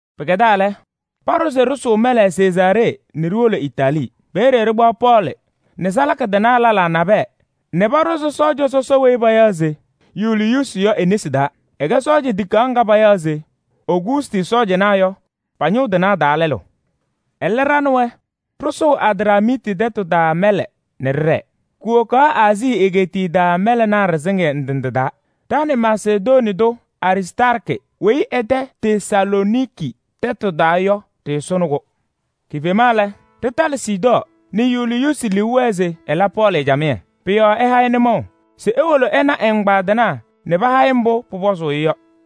Pɩkɛdaa lɛ, paɖʋ se ɖɩsʋʋ mɛlɛ Sezaaree nɛ ɖiwolo Itaalii. Peeye pakpaɣ Pɔɔlɩ nɛ salaka tɩnaa lɛlaa nabɛyɛ nɛ paɖʋzɩ sɔɔja sɔsɔ weyi payaɣ se Yuliyuusi yɔ e-nesi taa. Ɛkɛ sɔɔjanaa tikaɣ ŋga payaɣ se: Ogustɩ sɔɔjanaa yɔ, pa-ñʋŋ tɩnaa taa lɛlʋ. Ɛlɛ ɖa nɛ wɛ ɖɩsʋʋ Adramiiti tɛtʋ taa mɛlɛ nɛ ɖɩɖɛɛ, kuwokaɣ Aazii egeetiye taa mɛlɛnaa ɖɩsɩŋɩyɛ ndɩ ndɩ taa. Ɖa nɛ Masedonii tʋ Aristaarkɩ weyi ɛ-tɛ Tesalooniki tɛtʋ taa yɔ ɖɩɩsʋnɩ-kʋ. Kifema lɛ, ɖɩtalɩ Sidɔɔ nɛ Yuliyuusi liu wɛɛ se ɛla Pɔɔlɩ camɩyɛ. Pʋ-yɔɔ ɛha-ɩ nʋmɔʋ se ewolo ɛna ɛ-ɛgbaadɩnaa nɛ paha-ɩ mbʋ pʋpɔzʋʋ-ɩ yɔ.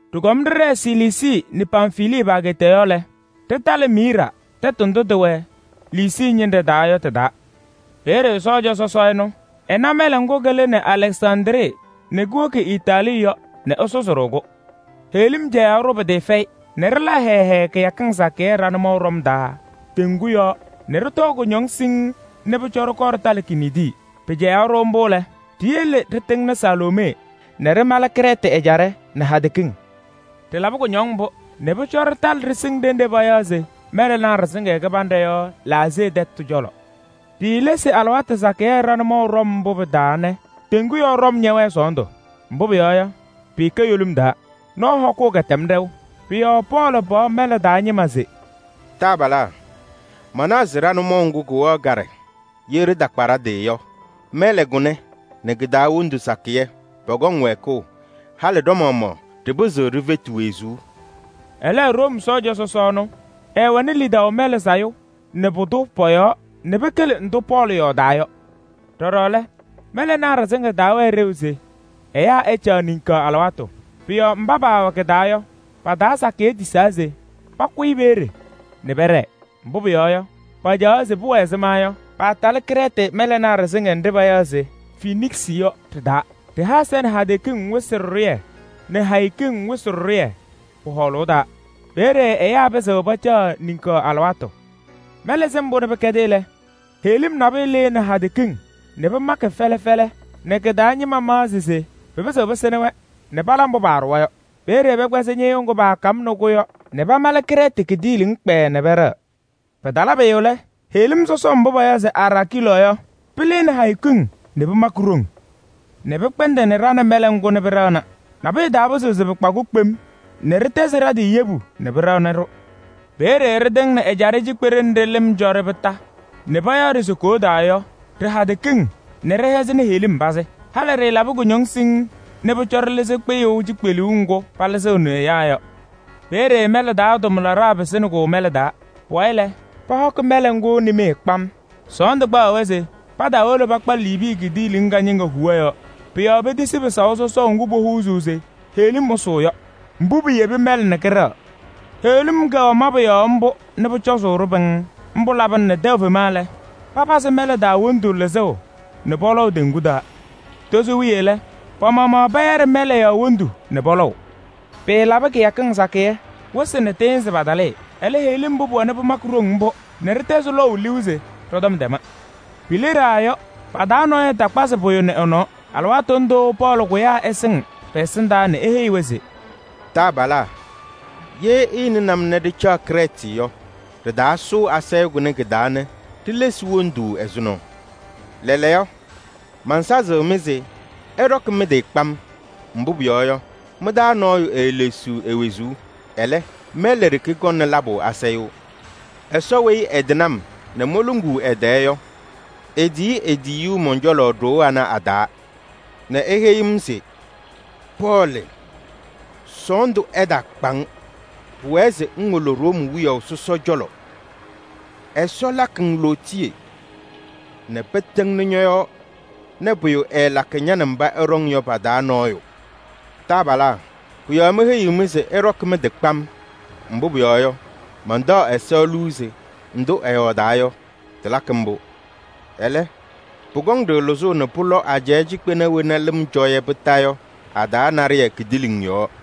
Ɖɩkɔm ɖɩɖɛɛ Siliisii nɛ Pamfilii pa-ageeta yɔɔ lɛ, ɖɩtalɩ Miiraa tɛtʋ ndʋ tɩwɛ Liisii ñɩnɖɛ taa yɔ tɩ-taa. Peeye sɔɔja sɔsɔ ɛnʋ ɛna mɛlɛ ŋgʋ kɩlɩnɩ Alɛksandrii nɛ kuwoki Itaalii yɔ nɛ ɛsʋzɩ-ɖʋ-kʋ. Heɣlim cɛyaɣ-ɖʋ pɩtɩɩfɛyɩ nɛ ɖɩla hɛɛɛ hɛɛɛ kɩyakɩŋ sakɩyɛ ɖa-nʋmɔʋ ɖɔm taa teŋgu yɔɔ nɛ ɖɩtɔɔ kʋñɔŋ siŋŋ nɛ pʋcɔ ɖɩkɔɔ ɖɩtalɩ Kiniidi. Pɩcɛyaɣ-ɖʋ mbʋ lɛ, ɖiyele ɖɩtɩŋnɩ Salmonee nɛ ɖɩmalɩ Krɛɛtɩ ɛjaɖɛ nɛ hadɛ kiŋ. Ɖɩlabɩ kʋñɔŋ mbʋ nɛ pʋcɔ ɖɩtalɩ ɖɩsɩŋ ɖenɖe payaɣ se Mɛlɛnaa Ɖɩsɩŋɩyɛ Kɩbanɖɛ yɔ Laasee tɛtʋ cɔlɔ. Ɖiilesi alɩwaatʋ sakɩyɛ ɖa-nʋmɔʋ ɖɔm mbʋ pɩ-taa nɛ teŋgu yɔɔ ɖɔm ñɛwɛɛ sɔɔndʋ. Mbʋ pʋyɔɔ yɔ, pɩɩkɛ yolim taa: nɔɔ hɔkʋʋ kɛtɛm ɖɛʋ. Pʋ-yɔɔ Pɔɔlɩ paɣ mɛlɛ taa ñɩma se: “Taabalaa! Manaɣ se ɖa-nʋmɔʋ ŋgʋ kʋwɛɣ kaɖɛ, ye ɖɩtakpa ɖa-tɩ yɔ, mɛlɛ kʋnɛ nɛ kɩ-taa wondu sakɩyɛ pɔkɔŋ wɛɛkʋʋ, halɩ ɖa-maɣmaɣ ɖɩpɩzɩɣ ɖifeti wezuu.” Ɛlɛ Room sɔɔja sɔsɔ ɛnʋ, ɛɛwɛnɩ lidaʋ mɛlɛ sayʋ nɛ kʋ-tʋ pɔ-yɔɔ nɛ pɩkɩlɩ ndʋ Pɔɔlɩ yɔɔdaa yɔ. Ɖɔɖɔ lɛ, mɛlɛnaa ɖɩsɩŋɩyɛ taawɛɛ ɖeu se ɛyaa ɛcaɣ niŋkaɣ alɩwaatʋ. Pʋ-yɔɔ mba paawɛ kɩ-taa yɔ, pa-taa sakɩyɛ tisaa se pakʋyɩ peeye nɛ pɛɖɛɛ. Mbʋ pʋyɔɔ yɔ, pacaɣaɣ se pʋwɛ ɛzɩma yɔ, paatalɩ Krɛɛtɩ mɛlɛnaa ɖɩsɩŋɩyɛ nɖɩ payaɣ se Feniksɩ yɔ. Ɖɩha ɛza nɛ hadɛ kiŋ wɩsɩ ɖɩɖʋyɛ nɛ hayo kiŋ wɩsɩ ɖɩɖʋyɛ pɔ-hɔɔlʋʋ taa. Peeye ɛyaa pɩzɩɣ pacaɣ niŋkaɣ alɩwaatʋ. Mɛlɛ sɩŋ mbʋ nɛ pɩkɛdɩ lɛ, heɣlim nabʋyʋ lɩnɩ hadɛ kiŋ nɛ pɩmakɩ fɛlɛ fɛlɛ nɛ kɩ-taa ñɩma maɣzɩ se pɩpɩzɩɣ pɩsɩnɩ-wɛ nɛ pala mbʋ paaɖʋwa yɔ. Peeye pɛkpɛzɩ ñɩɣyʋʋ ŋgʋ paakamnɩ-kʋ yɔ nɛ pamalɩ Krɛɛtɩ kidiiliŋ kpɛɛɛ nɛ pɛɖɛɣ. Pɩtala pʋyʋ lɛ, heɣlim sɔsɔm mbʋ payaɣ se Eraakɩlɔɔ yɔ, pɩlɩnɩ hayo kiŋ nɛ pɩmakɩ ɖoŋ nɛ pɩkpɛndɩnɩ ɖa nɛ mɛlɛ ŋgʋ nɛ pɩɖɛɣna pɩfɛyɩ-kʋ kpaʋ kpem nɛ ɖɩtɛzɩ ɖa-tɩ yebu nɛ pɩɖɛnɩ-ɖʋ. Peeye ɖɩtɩŋnɩ ɛjaɖɛ cikpeɖe nɖɩ lɩm cɔ-ɖɩ kondiko nɛ payaɣ-ɖɩ se Koodaa yɔ ɖɩ-hadɛ kiŋ nɛ ɖɩhɛzɩnɩ heɣlim pazɩ. Halɩ ɖɩɩlabɩ kʋñɔŋ siŋŋ nɛ pʋcɔ ɖɩlɩzɩ kpɩyʋʋ cikpeluu ŋgʋ palɩzɩɣnɩ ɛyaa yɔ. Peeye mɛlɛ taa tʋmlaɖaa pɩsɩnɩ-kʋ mɛlɛ taa. Pʋwayɩ lɛ, pɛkpɛyɩsɩ mɛlɛ ŋgʋ nimee kpam. Sɔɔndʋ kpaɣaɣ-wɛ se pataawolo pakpa Liibii kidiiliŋ kañɩŋa huwa yɔɔ. Pʋ-yɔɔ petisi pɩsaʋ sɔsɔʋ ŋgʋ popuzuu se heɣlim ɛsʋʋ yɔ. Mbʋ piyebi mɛlɛ nɛ kɩɖɛɣ. Heɣlim kɛwɛ mabʋ yɔɔ nɛ pʋcɔzʋʋ-ɖʋ pɩŋŋ. Mbʋ labɩna nɛ tɛʋ fema lɛ, papazɩ mɛlɛ taa wondu lɩzʋʋ nɛ pɔlɔʋ teŋgu taa. Tozo wiye lɛ, pa-maɣmaɣ pɛyɛɖɩ mɛlɛ yɔɔ wondu nɛ pɔlɔʋ. Pɩɩlabɩ kɩyakɩŋ sakɩyɛ, wɩsɩ nɛ tɩɩnzɩ patalɩɩ. Ɛlɛ heɣlim mbʋ pʋwɛnɩ pɩmakɩ ɖoŋ mbʋ nɛ ɖɩtɛzɩ lɔʋ liu se ɖɔ-tɔm tɛma. Pileɖaa yɔ, pa-taa nɔɔyʋ takpazɩ pʋyʋ nɛ ɛ-nɔɔ. Alɩwaatʋ ndʋʋ Pɔɔlɩ kʋyaa ɛsɩŋ pɛ-ɛsɩndaa nɛ eheyi-wɛ se: “Taabalaa! Ye ɩɩnɩnɩ-m nɛ ɖɩcaɣ Krɛɛtɩ yɔ, ɖɩtaasʋʋ asayʋʋ kʋnɛ kɩ-taa nɛ ɖilesi wondu ɛzʋnɔ. Lɛɛlɛɛyɔ, mansazɩɣ-mɩ se ɩɖɔkɩ mɩ-tɩ kpam. Mbʋ pʋyɔɔ yɔ, mɩ-taa nɔɔyʋ eelesiɣ e-wezuu. Ɛlɛ, mɛlɛ ɖeke kɔŋnɩ labʋ asayʋʋ. Ɛsɔ weyi ɛtɩnɩ-m nɛ moluŋuu ɛ-tɛɛ yɔ, etiyi e-tiyiyu mɔn-cɔlɔ ɖoo ana a-taa nɛ eheyi-m se: ‘Pɔɔlɩ! Sɔɔndʋ ɛtaakpa-ŋ. Pʋwɛɛ se ŋwolo Room wiyaʋ sɔsɔ cɔlɔ. Ɛsɔ lakɩ-ŋ lootiye nɛ pɩtɩŋnɩ ñɔ-yɔɔ nɛ pʋyʋ ɛɛlakɩ ña nɛ mba ɩɖɔŋ yɔ pa-taa nɔɔyʋ.’ Taabalaa! Pʋ-yɔɔ meheyiɣ-mɩ se ɩɖɔkɩ mɩ-tɩ kpam, mbʋ pʋyɔɔ yɔ, mantaɣ Ɛsɔ liu se ndʋ ɛyɔɔdaa yɔ, tɩlakɩ mbʋ. Ɛlɛ, pʋkɔŋ-ɖʋ lɩzʋʋ nɛ pʋlɔ ajɛɛ cikpena wena lɩm cɔ-yɛ kondiko yɔ a-taa naɖɩyɛ kidiiliŋ yɔɔ.”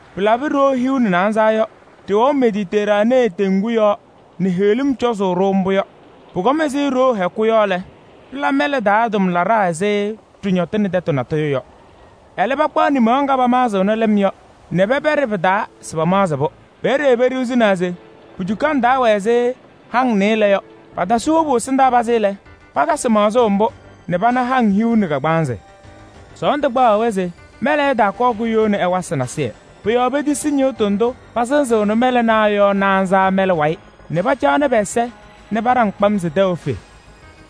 Pɩlabɩ ɖoo hiu nɛ naanza yɔ, ɖɩwɛʋ Mediteraanee teŋgu yɔɔ nɛ heɣlim cɔzʋʋ-ɖʋ mbʋ yɔ. Pʋkɔm ɛzɩ ɖoo hɛkʋ yɔ lɛ, pɩla mɛlɛ taa tʋmlaɖaa ɛzɩ ɖɩñɔtɩnɩ tɛtʋ natʋyʋ yɔ. Ɛlɛ pakpaɣ nimaɣ ŋga pamaɣzɩɣnɩ lɩm yɔ nɛ pɛpɛɖɩ pɩ-taa se pamaɣzɩ-pʋ. Peeye peɖiɣzinaa se pu-cukaŋ taa wɛ ɛzɩ haŋ nɩɩlɛ yɔ. Patasɩ wobu ɛsɩndaa pazɩ lɛ, patasɩ maɣzʋʋ mbʋ nɛ pana haŋ hiu nɛ kagbaanzɩ. Sɔɔndʋ kpaɣaɣ-wɛ se mɛlɛ ɛtaakɔɔ kuyoni ɛwasɩ nasɩyɩ. Pʋ-yɔɔ petisi ñɩɣtʋ ndʋ pasɩzɩɣnɩ mɛlɛnaa yɔ naanza mɛlɛ wayɩ nɛ pacaɣnɩ pɛ-ɛza paɖaŋ kpam se tɛʋ efe.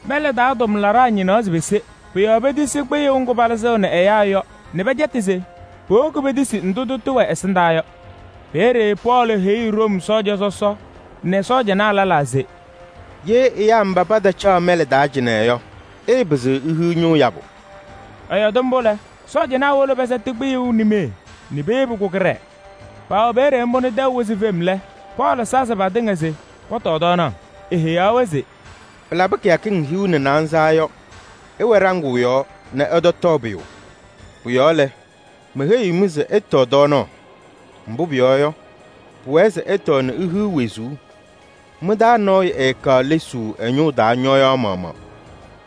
Mɛlɛ taa tʋmlaɖaa ñɩnaɣ se pese. Pʋ-yɔɔ petisi kpɩyʋʋ ŋgʋ palɩzɩɣnɩ ɛyaa yɔ nɛ pɛcɛtɩ se powoki petisi ndʋ tʋtʋ wɛ ɛsɩndaa yɔ. Peeye Pɔɔlɩ heyi Room sɔɔja sɔsɔ nɛ sɔɔjanaa lɛlaa se: “Ye ɛyaa mba patacaɣ mɛlɛ taa cɩnɛ yɔ, ɩɩpɩzɩɣ ihiɣ ñʋʋ yabʋ.” Ɛyɔɔdɩ mbʋ lɛ, sɔɔjanaa wolo pɛsɛtɩ kpɩyʋʋ nimee nɛ peyebi-kʋ kɩɖɛɛ. Paawɛ peeye mbʋ nɛ tɛʋ wɩzɩ fem lɛ, Pɔɔlɩ sazɩ patɩŋa se pɔtɔɔ tɔɔnaɣ, eheyaɣ-wɛ se: “Pɩlabɩ kɩyakɩŋ hiu nɛ naanza yɔ, ɩwɛ ɖaŋʋʋ yɔɔ nɛ ɩtɔtɔɔ pʋyʋ. Pʋ-yɔɔ lɛ, meheyiɣ-mɩ se ɩtɔɔ tɔɔnaɣ. Mbʋ pʋyɔɔ yɔ, pʋwɛɛ se ɩtɔɔ nɛ ihiɣ wezuu, mɩ-taa nɔɔyʋ ɛɛkaɣ lesuu ɛ-ñʋʋ taa ñɔyaɣ maɣmaɣ.”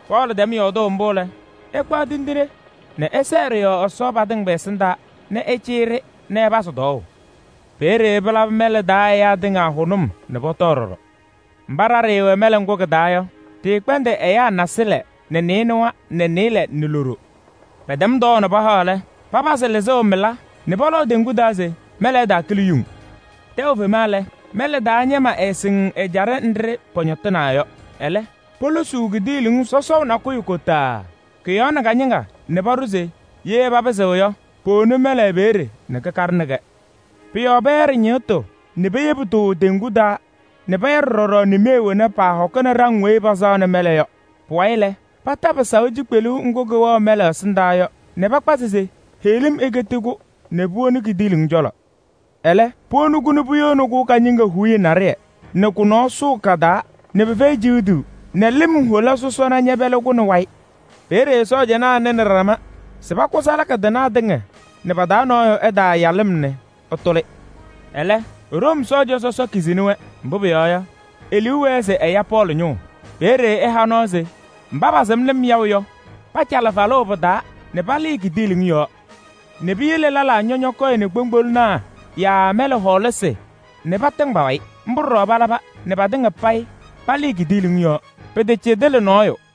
Pɔɔlɩ tɛm yɔɔdʋʋ mbʋ lɛ, ɛkpaɣ tindine nɛ ɛsɛɛ ɖɩ-yɔɔ Ɛsɔ patɩŋa pɛ-ɛsɩndaa nɛ ɛcɩyɩ-ɖɩ nɛ ɛpazɩ tɔɔʋ. Peeye pɩlabɩ mɛlɛ taa ɛyaa tɩŋa hʋnʋm nɛ pɔtɔɔ ɖɔɖɔ. Mba ɖa ɖɩɩwɛ mɛlɛ ŋgʋ kɩ-taa yɔ, ɖɩɩkpɛndɩ ɛyaa naasɩlɛ nɛ nɩɩnʋwa nɛ nɩɩlɛ nɛ loɖo. Pɛtɛm tɔɔʋ nɛ pahaɣ lɛ, papazɩ lɩzʋʋ mɩla nɛ pɔlɔʋ teŋgu taa se mɛlɛ ɛtaakɩlɩ yuŋ. Tɛʋ fema lɛ, mɛlɛ taa ñɩma ɛɛsɩŋ ɛjaɖɛ nɖɩ pɔñɔtɩnaa yɔ. Ɛlɛ, polosuu kidiiliŋ sɔsɔʋ nakʋyʋ kotaaa, kʋ-yɔɔ nɛ kañɩŋa nɛ paɖʋ se ye papɩzɩɣ yɔ, powoni mɛlɛ peeye nɛ kɩkaɖɩnɩ-kɛ. Pʋ-yɔɔ pɛyɛɖɩ ñɩɣtʋ nɛ peyebi-tʋ teŋgu taa nɛ pɛyɛɖɩ ɖɔɖɔ nimee wena paahɔkɩnɩ ɖaŋ weyi pasaɣnɩ mɛlɛ yɔ. Pʋwayɩ lɛ, pata pɩsaʋ cikpeluu ŋgʋ kɩwɛɣ mɛlɛ ɛsɩndaa yɔ nɛ pakpazɩ se heɣlim eketi-kʋ nɛ puwoni kidiiliŋ cɔlɔ. Ɛlɛ, puwoni-kʋ nɛ puyoni kañɩŋa huuye naɖɩyɛ nɛ kʋ-nɔɔ sʋʋ ka-taa nɛ pɩfɛyɩ ciɣduu nɛ lɩm hola sɔsɔna ñɛpɛlɩ-kʋ nɛ wayɩ. Peeye sɔɔjanaa nɩnɩ ɖama se pakʋ salaka tɩnaa nɛ pa-taa nɔɔyʋ ɛtaaya lɩm nɛ ɛtʋlɩ. Ɛlɛ, Room sɔɔja sɔsɔ kizini-wɛ, mbʋ pʋyɔɔ yɔ, e-liu wɛɛ se ɛya Pɔɔlɩ ñʋʋ. Peeye ɛha nɔɔ se mba pasɩm lɩm yaʋ yɔ, pacalɩ falʋʋ pɩ-taa nɛ paya nɛ palɩɩ kidiiliŋ yɔɔ nɛ piyele lɛlaa ñɔñɔkɔyɩnɩ kpoŋgbolonaa yaa mɛlɛ hɔɔlasɩ nɛ patɩŋ pa-wayɩ. Mbʋ ɖɔɖɔ palaba nɛ patɩŋa payɩ palɩɩ kidiiliŋ yɔɔ, pɩtacɩdɩlɩ nɔɔyʋ.